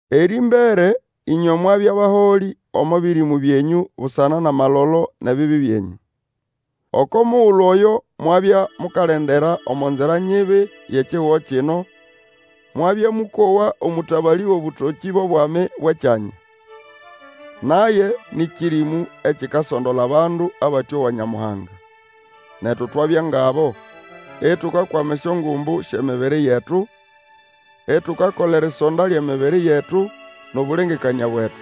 Erĩmbere ĩnywe mwabya baholĩ omo bĩrĩmũ byenyũ busana nʼamalolo nʼebibi byenyũ. Oko mugulu oyo mwabya mukalendera omo nzira nyibi yʼekihugo kino; mwabya mũkowa omũtabalĩ wʼobũtokĩ bʼobwami bwʼekyanya. Naye nĩ kĩrĩmũ ekikasondola abandu abatĩowa Nyamuhanga. Netu twabya ngʼabo, itukakwama esyongumbu syʼemibiri yetu, itukakola erisonda lyʼemibiri yetu nʼobũlengekanĩa bwetu.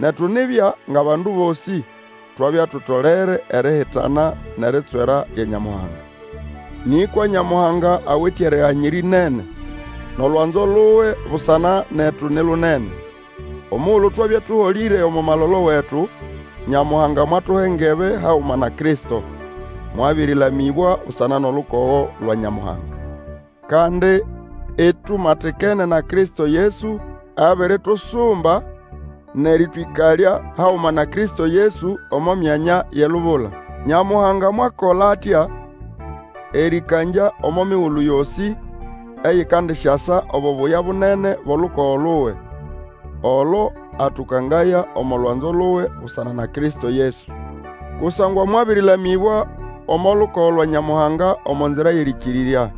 Netu nibya ngʼabandu bosĩ, twabya tutolere erihitana nʼeritswera lya Nyamuhanga. Nĩkwa Nyamuhanga awite eriganyira ĩnene, nʼolwanzo luwe busana netu ni lunene. Omugulu twabya tũholĩre omo malolo wetu, Nyamuhanga mwatuha engebe haguma na Kristo; mwabĩrĩlamĩbwa busana nʼolukogo lwa Nyamuhanga. Kandi, itumatikene na Kristo Yesu, abiritusumba nʼerĩtwĩkalya haguma na Kristo Yesu omo myanya yʼelubula. Nyamuhanga mwakola atya erĩkangya omo migulu yosĩ eyikandisyasa obubuya bunene bwʼolukogo luwe; olo atũkangaya omo lwanzo luwe busana na Kristo Yesu. Kusangwa mwabĩrĩlamĩbwa omo lukogo lwa Nyamuhanga omo nzira yʼerĩkĩrĩrya,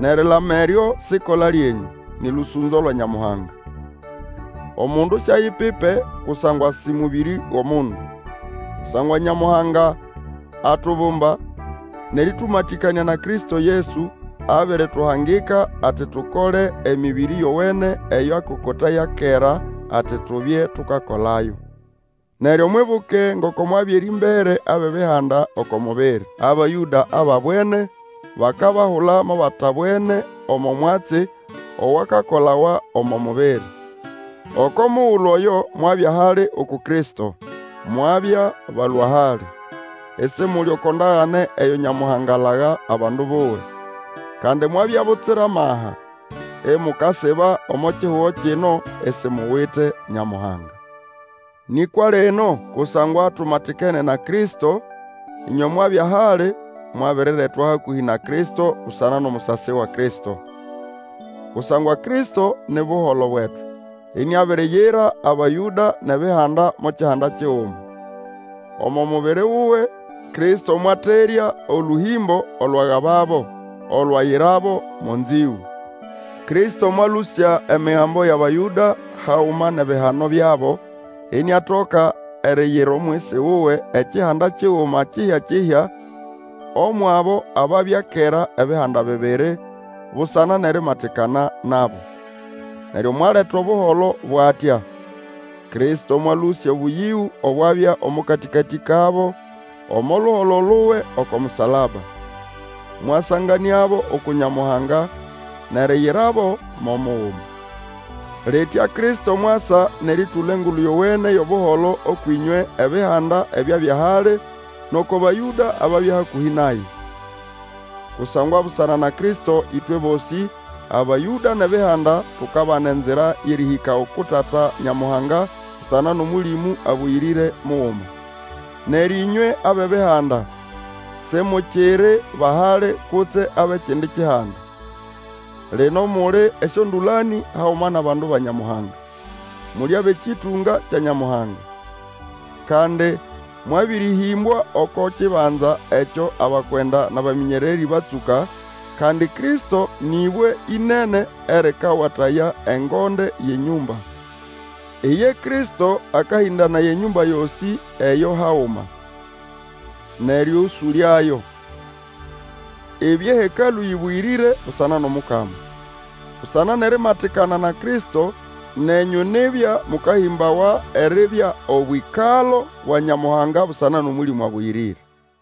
nʼerilama eryo siʼkola lyenyũ, nĩ lũsũnzo lwa Nyamuhanga. Omundu siayipipe, kusangwa sĩ mũbĩrĩ wʼomundu. Kusangwa Nyamuhanga atubumba, nʼerĩtũmatĩkanĩa na Kristo Yesu, abirituhangika ati tukole emĩbĩrĩ yowene eyo akokotaya kera, ati tubye tukakolayo. Neryo mwibuke ngoko mwabya erĩmbere abʼEbihanda oko mubiri. Abayũda ababwene, bakabahula mo batabwene omo mwatsi owakakolawa omo mubiri. Oko mugulu oyo mwabya hali uku Kristo, mwabya balũa-hali; isimuli oko ndagane eyo Nyamuhanga alaga abandu buwe. Kandi mwabya butsira amaha, imukasiba omo kihugo kino isimuwite Nyamuhanga. Nĩkwa lino, kusangwa tumatikene na Kristo, ĩnywe mwabya hali, mwabiriretwa hakũhĩ na Kristo busana nʼomusasi wa Kristo. Kusangwa Kristo ni buholo bwetu, iniabiriyira Abayũda, nʼEbihanda, mo kihanda kiguma. Omo mubiri wuwe, Kristo mwaterya olũhĩmbo olwagababo, olwayirabo mo nzĩgũ. Kristo mwalũsya Emigambo yʼAbayũda haguma nʼebihano byabo, iniatoka eriyira omwisi wuwe ekihanda kiguma kihya-kihya omwʼabo ababya kera ebihanda bibiri, busana nʼerimatikana nabo. Neryo mwaleta Obuholo bwʼatya. Kristo mwalũsya obũyĩgũ obwabya omo katĩkatĩ kabo, omo luholo luwe oko musalaba. Mwasanganĩabo uku Nyamuhanga, nʼeriyirabo mo muguma. Litya Kristo mwasa nʼerĩtũla Engulu Yowene yʼobuholo ũkwʼĩnywe Ebihanda ebyabya hali, nʼoko Bayũda ababya hakũhĩ naye. Kusangwa busana na Kristo ĩtwe bosĩ, Abayũda nʼEbihanda, tukabana enzira yʼerĩhĩka uku Tata Nyamuhanga busana nʼOmũlĩmũ Abũyĩrĩre muguma. Neryo ĩnywe abʼEbihanda, simukiri ba hali kutse abʼekindi kihanda; lino muli esyondũlanĩ haguma nʼabandu ba Nyamuhanga, muli abʼekĩtũnga kya Nyamuhanga! Kandi mwabĩrĩhĩmbwa oko kibanza ekyo abakwenda nʼabamĩnyererĩ batsũka, kandi Kristo nĩʼbwe ĩnene erĩkawataya engonde yʼenyũmba. Iye Kristo akahĩndanaya enyũmba yosĩ eyo haguma, nʼerĩũsũlyayo, ibye hekalũ yĩbũyĩrĩre busana nʼOmukama. Busana nʼerimatikana na Kristo, nenyũ nibya mũkahĩmbawa eribya obwĩkalo bwa Nyamuhanga busana nʼOmũlĩmũ Abũyĩrĩre.